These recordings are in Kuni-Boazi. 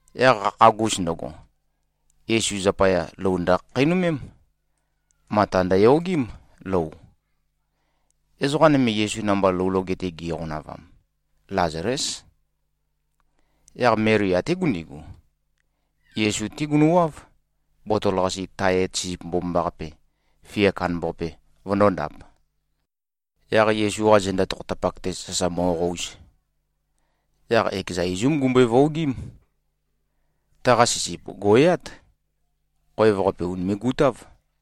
Yaq qakhagus ndøgo, Yesu zapaya, lou ndøkhakheinømém. Mata ndøyogím, lou. Ezoqa nøme, Yesu namba lou loge-te giqonavam, Lazalés. Yaq Meli até gundigu, Yesu-té gunøwáv, botol-qase tae et sisip mbomambaqape, fia kandambaqape, vøndōndap, yaq Yesu-qa zenda tokhotapak-te sasa mo꞉qouz. Yaq ekeza izúm gumbøe-vuogím. Taqa sisip gò꞉yát. Khoev-qape ùnime꞉-gutáv.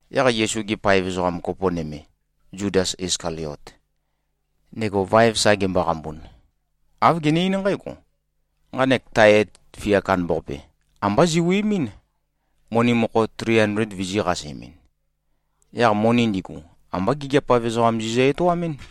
Yaq Yesu-ge paev ezoqa kopo nøme, Zudas Iskaliot, ndego vaev sa gemboqambun, āv gene-eín nqǽgo, “Nqanek tae et fia kandambaqape, ambá ziwi꞉mín, moni mokho tri andled vizī-qasemɨn. Yaq moni ndigu, ambá gigiap-av ezoqam zizø-etoamɨ́n.”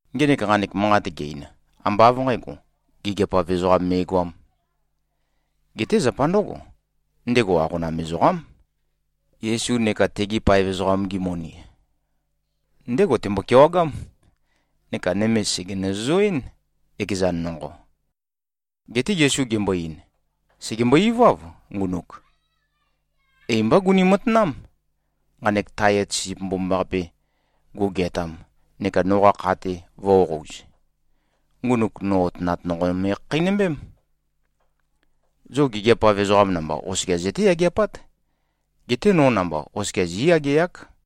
Ngenek nqanek manqat ge-ein, ambá av nqǣgo, gigiap-av ezoqam me꞉goām. Geté zapa ndǿgo: Ndego aqona ezoqám. Yesu neka tegi paev ezoqam-gi moni, ndégo tembo-kewagám neka nøme sège-nøzøzoɨ́n, ekezan nonqo. Geté Yesu gembo-ein, “Sègembo-iváv, ngunuk. Ei mbá guni-matanám. Nqanek tae et sisip mbomambaqape gugeatam neka noqa kha-te vō꞉qouz, ngunuk no otønat nonqo me꞉khakheinømbém. Zo gigiap-av ezoqam namba oskia zøté-yageapát. Geté no namba, oskia zí꞉yageák.”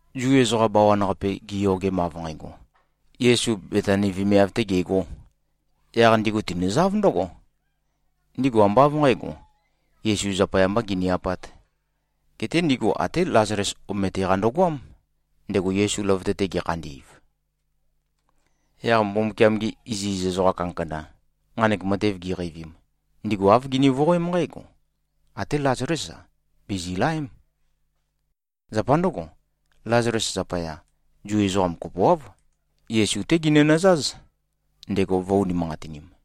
Zu ezoqa bawan-qape giyogem av nqægo, Yesu Betani vemiav-tē gegō, yaq ndigu tinøzáv ndǿgo. Ndigu ambá av nqǣgo, Yesu zapaya mbā gini-apāt, geté ndigu até Lazales omete-qa ndøgoám, ndego Yesu løvøte-te gekhandi꞉v. Yaq Mbumbukiam-gi iziz ezoqa kandakanda, nqanek matev giqeivim, ndigu āv gini-voqoém nqǽgo, “Até Lazalés-a, bìzilaém.” Zapa ndǿgo, Lazales zapaya, Zu ezoqa kopoáv, Yesu-té ginønøzáz, ndego vø̄-unimanqatinim.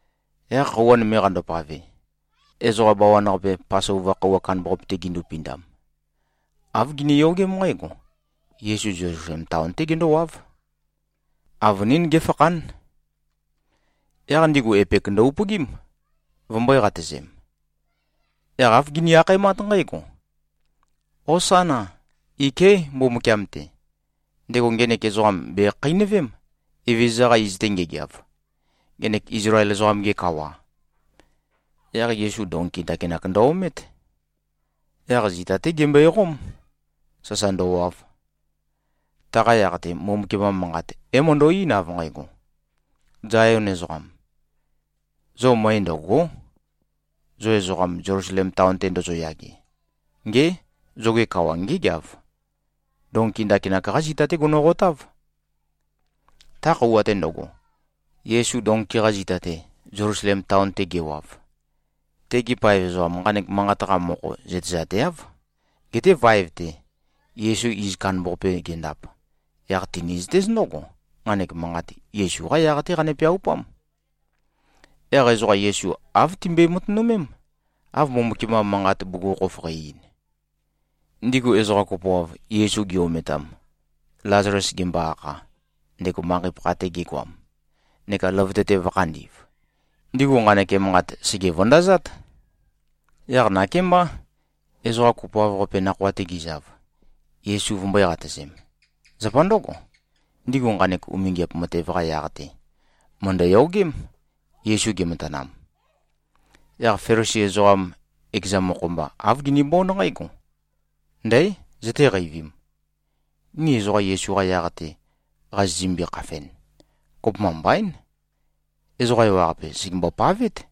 Yaq khøuwa nøme qandopave, ezoqa bawan-qape Pasova khøuwa kandambaqape-te gindupindam, āv giniyogém nqǽgo: Yesu Zelusalem taon-té gendówáv. Avønín géfakhán. Yaq ndigu epek ndø-upøgím, vømbø̄e-qatøzem. Yaq āv gini-akhaemát nqǽgo, “Hosána! Iké꞉ Mbumbukiam-te. Ndego ngenek ezoqam bèkhakheinøvém, Evezøza-qa iz-te ngegeav, ngenek Izlael ezoqam-ge kawa.” Yaq Yesu donki ndakinak ndø-omét. Yaq zita-té gembøeqóm, sasa ndøwav. Taqa yaq-te, Mbumbukiam-qa manqat, é-møndo꞉-eín, av nqægo, “Zayon ezoqam. Zo møe ndø̀go᷄, zo ezoqam, Zelusalem taon-te ndozoyage. Ngé! Zoge kawa ngégeav. Donki ndakinak-qá zita-té gonoqotáv.” Ta khøuwa-te ndøgo, Yesu donki-qa zita-te, Zelusalem taon-te gewav, tegi paev ezoqam nqanek manqat-qa mokho zøtezateáv. Geté vaev-te, Yesu iz kandambaqape gendap, yaq tinizøtéz ndǿgo, nqanek manqat, Yesu-qá yaq-té qane-peaupám. Yaq ezoqa Yesu āv timbøe-matønømém, av Mbumbukiam-qa Manqat bugukhokhof qæ-ein. Ndigu ezoqa kopoav, Yesu gi-ometam, Lazales gembo-akha, ndego manqei-pakha-te gegoam, neka løvøte-te vø̄khandi꞉v, ndigu nqanek emanqat sège-vøndazát. Yaq nakémbá, ezoqa kopoav-qape nakhoa-te gizav, Yesu vømbø̄e-qatøzem. Zapa ndǿgo, ndigu nqanek umingiap matev-qa yaq-te, mø̀ndøyogém, Yesu gematanam. Yaq Felisi ezoqam ekeza mokho-mba, āv ginibónd nqǽgo, “Ndǽ, zøtéqeivīm? Ni ezoqa Yesu-qa yaq-te qazizømbi-khafen, kopømba mbaín. Ezoqa ewaqape sègembo-pavét.”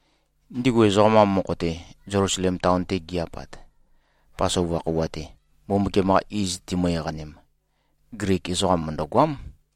Ndigu ezoqam-qa mokho-te, Zelusalem taon-te gi-apat, Pasova khøuwa-te Mbumbukiam-qa iz timø-eqanem, Glik ezoqam mø̀ndøgoám.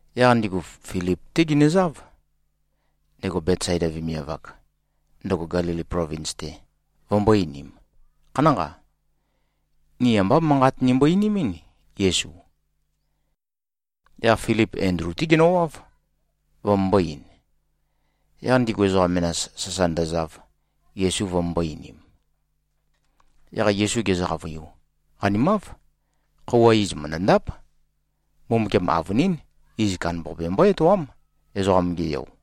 Yaq ndigu Filip-té ginøzáv, ndego Betsaida vemiav-ak, ndøgo Gelili plovins-te, vømbō-einim, “Khanánqa. Ni ambá manqat nimbo-einimɨ́n, Yesu.” Yaq Filip Endlu-té genøwáv, vømømbō-ein. Yaq ndigu ezoqa menas, sasa ndøzav, Yesu vømømbō-einim. Yaq Yesu gezø-qavøiu, “Qanimáv. Khøuwa iz mø̀ndøndáp. Mbumbukiam avønín, iz kandambaqape mbó-etoám, Ezoqam-ge Yo.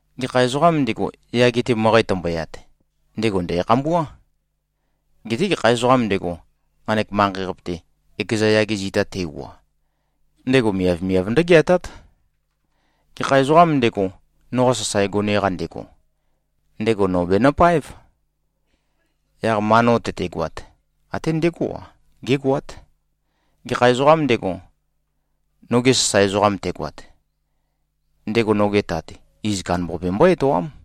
Gekha ezoqām ndego, yage-te møqæ tømboyat, ndego ndæ̀khambuá. Geté gekha ezoqām ndego, nqanek manqei-qape-te, ekeza yage zita te꞉wua, ndego miavmiav ndǿgeatát. Gekha ezoqām ndego, noqa sasae gone-qa ndego, ndego no bènøpáev. Yaq ma no tøtegoat, até ndegó-a, gégoát. Gekha ezoqām ndego, noge sasae ezoqam tegoat, ndego noge Tat, iz kandambaqape mbó-etoám.”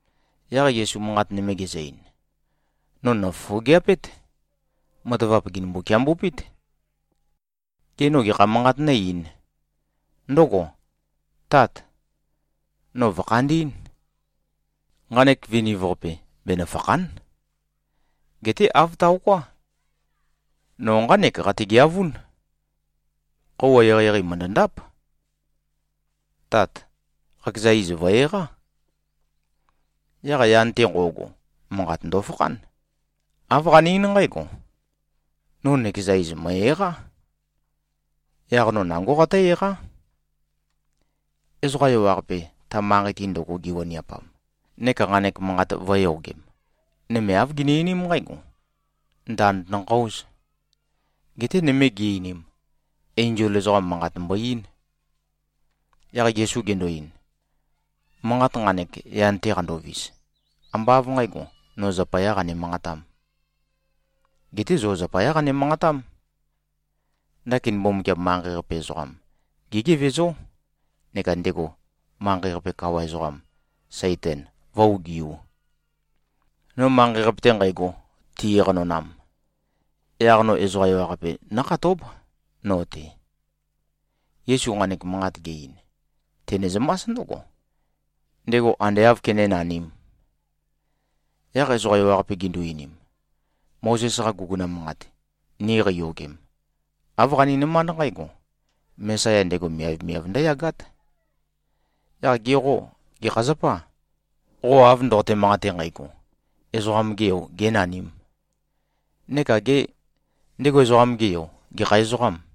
Yaq Yesu manqat nøme gezø-ein, “No nòfofogeapét. Matavap gènømbu-kiambøpét. Gê, no gekha manqat nó-eīn? Ndǿgò? ‘Tát! No vø̀khandī꞉n. Nqanek viniv-qape benøfàkha᷄n.’ Geté āv taoká! No nqánek qategeavún. Khøuwa eqeieqei mø̀ndøndáp. Tát! Qakeza iz vø̀-eqá!” Yaq yan-te nqo꞉go, manqat ndofakhán. Āv qane-eín nqǽgo, “No nøkeza iz, mø̀e-eqá. Yaq no nangó qatǿ-eqá.” Ezoqa ewaqape, ta manqei-te ndøgo giwaniapam neka nqanek manqat vø̄yogem, nøme āv gini-einím nqǽgo, “Ndand ndønqøōz.” Geté nøme gi-einim, “Enzol ezoqam, manqat mbo-eín.” Yaq Yesu gendo-ein, “Manqat nqanek, yan-te qandovis, ambá av nqǣgo, no zapayā qane-manqatām. Geté zo zapayá qane-manqatám. Ndakin Mbumbukiam manqei-qape ezoqam gégevezó, neka ndego manqei-qape kawa ezoqam, Saitan, vǿ-ogiū. No manqei-qape-te nqægo, ti-eqanonam, yaq no ezoqa ewaqape nókhatób, no-te.” Yesu nqanek manqat ge-ein, tenezømás ndǿgo, ndego ande āv kenénanīm. Yaq ezoqa ewaqape gindu-einim, “Mozes-qa guguna manqat, ni qeiyogem, āv qaninømánd nqǽgo, Mesaya ndego miavmiav ndǿyagát. Yaq ge qô, gekha zapâ, qo av ndoqote-manqate nqægo, Ezoqam-ge Yo gēnanīm? Neka gê, ndego Ezoqam-ge Yo, gekha ezoqâm?”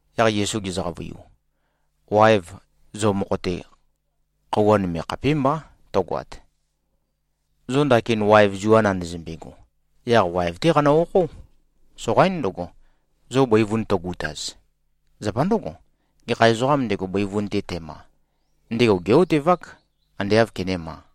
Yaq Yesu gezø-qavøiu, “Waev, zo mokho-te khøuwa nøme khapémbá tøgoat. Zo ndakin waev zua nandazømbego, yaq waev-té qanø-okhó. Soqaín ndøgo, zo bøivun tøgutaz. Zapa ndǿgo, gekha ezoqām ndego, bøivun-te tema, ndego gé꞉-otevák, ande āv kenéma.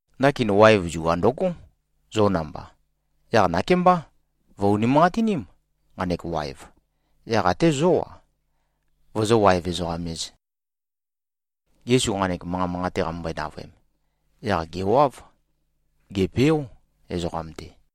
Ndakin waev zua ndøgó, zo namba. Yaq nakémbá, vø̀-unimanqatiním, nqanek waev, yaq até zó-a, vozó-waev-ezoqam-ēz.” Yesu nqanek manqa manqate qamømbøe-navøem, yaq gèwáv. Gèpeó, ezoqam-te.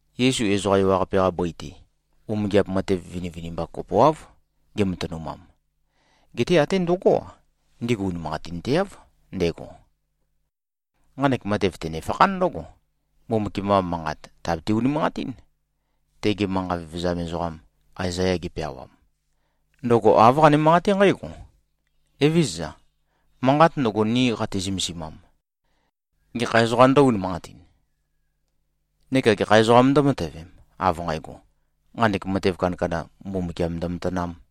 Yesu ezoqa ewaqape-qa bøi-te, umingiap matev vinivinimba kopoáv gematønumam. Geté até ndøgó-a, ndigu unimanqatinteáv ndego. Nqanek matev tønefakhán ndǿgo, Mbumbukiam-qa Manqat tàbete-unimanqatín, tege manqa vevezam ezoqam Aezaya gepeawam. Ndøgo āv qane-manqaté nqǽgo, “Evézøza. Manqat ndøgo, ni qati-zømesimam, gekha ezoqā ndǿ-unimanqatin? Neka gekha ezoqā ndǿmatøvem, av nqægo, nqanek matev kandakanda, Mbumbukiam ndømatanām?”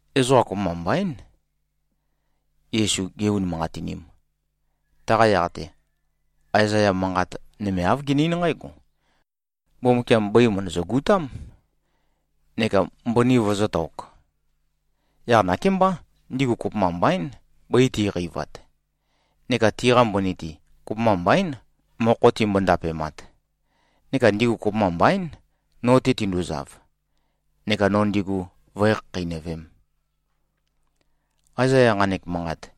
Ezoqa kopømba mbaín, Yesu gé-unimanqatinīm. Taqa yaq-te, Aezaya manqat nøme āv gene-eín nqǽgo, “Mbumbukiam bøi mø̀ndøzø-gutám, neka mbøni vøzø̄tok. Yaq nakémbá, ndigu kopømba mbaín, bøi ti꞉qeivat neka tiqa mbøni-te, kopømba mbaín, mokho timbo-ndapemat, neka ndigu kopømba mbaín, no-te tinduzav, neka no ndigu vǿe-khakheinøvēm.” Aezaya nqanek manqat,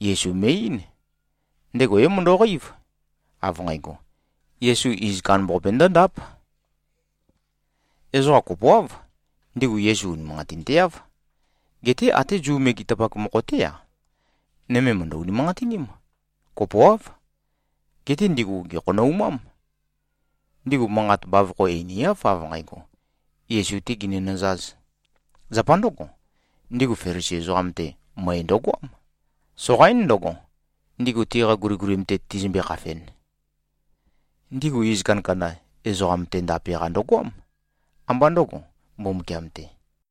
Yesu me꞉-eín. Ndego é-møndo꞉qeív, av nqægo, Yesu iz kandambaqape ndǿndáp. Ezoqa kopoáv, ndigu Yesu unimanqatinteáv. Geté até Zu megetapak mokho-té-a, nøme mø̀ndø-unimanqatiním. Kopoáv. Geté ndigu gèkhonoumám. Ndigu manqat bavokho einiáv, av nqægo, Yesu-tē ginønøzāz. Zapa ndǿgo, ndigu Felisi ezoqam-te møe ndøgoám. Soqaín ndǿgo, ndigu tiqa guligulim-te tizømbe-khafen. Ndigu iz kandakanda, ezoqam-te ndape-qa ndøgoám, ambá ndø̄go, Mbumbukiam-te.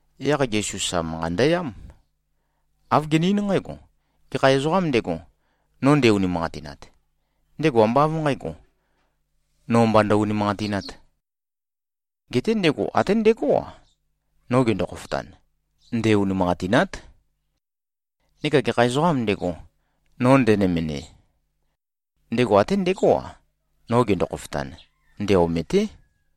Yaq Yesu sa manqa ndøyám. Āv gene-eín nqǽgo, “Gekha ezoqām ndego, no nde-unimanqatinat, ndego ambá av nqǣgo, no mba ndø-unimanqatināt. Geté ndego até ndegó-a, no gendo-khofotan, nde-unimanqatînát. Neka gekha ezoqām ndego, no ndenømende, ndego até ndegó-a, no gendo-khofotan, nde-omêté.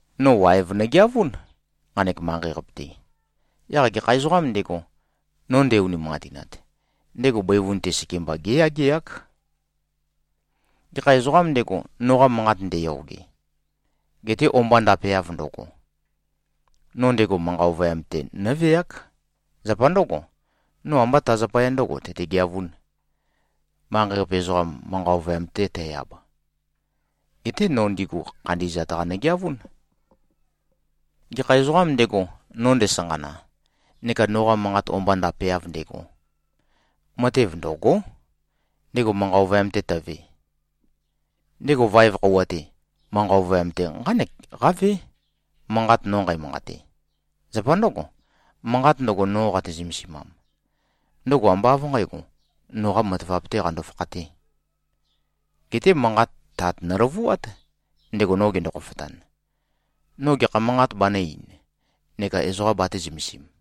No waev nogeavún, nqanek manqei-qape-te. Yaq gekha ezoqām ndego, no nde-unimanqatinat, ndego bøivun-te sekemba géyageák. Gekha ezoqām ndego, noqa manqat ndeyoge, gete o-mba ndapeav ndøgo, no ndego manqa ovøyam-te nǿveák. Zapa ndǿgo, no ambá ta zapaya ndǿgo, tøtegeavún, manqei-qape ezoqam manqa ovøyam-te tæ-ab. Geté no ndigu khandi꞉zat-qa nogeavún. Gekha ezoqām ndego, no ndesanqana neka noqa manqat o-mba ndapeav ndego, matev ndø̂gó, ndego manqa ovøyam-te tøve. Ndego vaev khøuwa-te, manqa ovøyam-te, nqánek qávé, manqat no nqæmanqate. Zapa ndǿgo, manqat ndøgo, no qate-zømesimam, ndøgo ambá av nqǣgo, noqa matavap-tē qando-fakhatē. Geté manqat, Tat nøløvuát, ndego no gendo-khofotan, no gekha manqat banø̄-ein neka ezoqa batē-zømesim.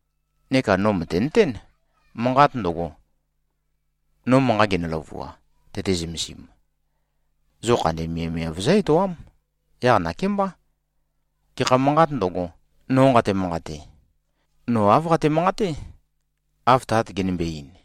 Neka no mø̀tenøtén, manqat ndøgo, no manqa genø-løvua, tøte-zømesim, zo khandi miavmiav zǿ-etoám. Yaq nakémbá, gekha manqāt ndøgo, no nqate-manqate, no āv qate-manqaté, av Tat genømbe-ein.”